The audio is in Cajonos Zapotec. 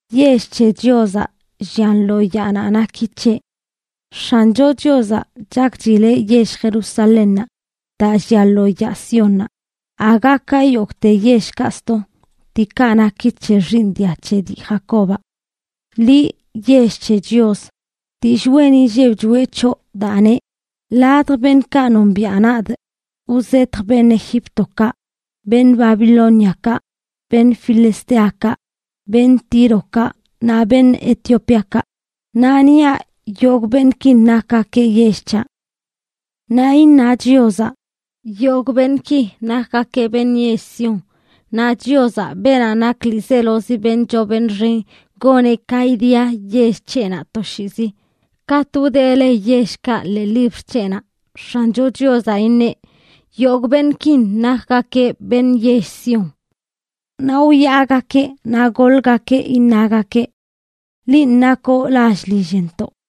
Yell c̱he Chiozaꞌ llian lo yaanaꞌ naki c̱heꞌ. X̱ancho Chiozaꞌ chakchileꞌ yell Jerusalénnaꞌ daa llia lo yaa Siónnaꞌ, aga ka yogꞌte yellkaꞌ sto, diikaꞌ naki c̱he xiiṉ dia c̱he dii Jacobaꞌ. Liꞌ, yell c̱he Chios, dillꞌ wen inlleb choꞌe c̱hoꞌ, daa neꞌ: “Ladj beṉꞌkaꞌ nombiaꞌ nadꞌ wzetjꞌ beṉꞌ Egíptokaꞌ, beṉꞌ Babilóniakaꞌ beṉꞌ filisteokaꞌ, beṉꞌ Tírokaꞌ, naꞌ beṉꞌ Etiopíakaꞌ; naꞌ niaꞌ yogꞌ beṉꞌkin nakgakeꞌ yell c̱haꞌ.” Naꞌ iṉa Chiozaꞌ: “Yogꞌ beṉꞌki nakgakeꞌ beṉꞌ yell Sión.” Naꞌ Chiozaꞌ, beenaꞌ nak ḻiizelozi beṉꞌ choo beṉꞌ xen, goneꞌ ka idia yell c̱heꞌnaꞌ toshiizi. Katꞌ wdee le yellkaꞌ ḻee libr c̱heꞌnaꞌ, X̱ancho Chiozaꞌ iṉeꞌ: “Yogꞌ beṉꞌkin nakgakeꞌ beṉꞌ yell Sión.” Naꞌ wyaagakeꞌ naꞌ goḻgakeꞌ iṉagakeꞌ: “Linꞌ nakoꞌ lall lillntoꞌ.”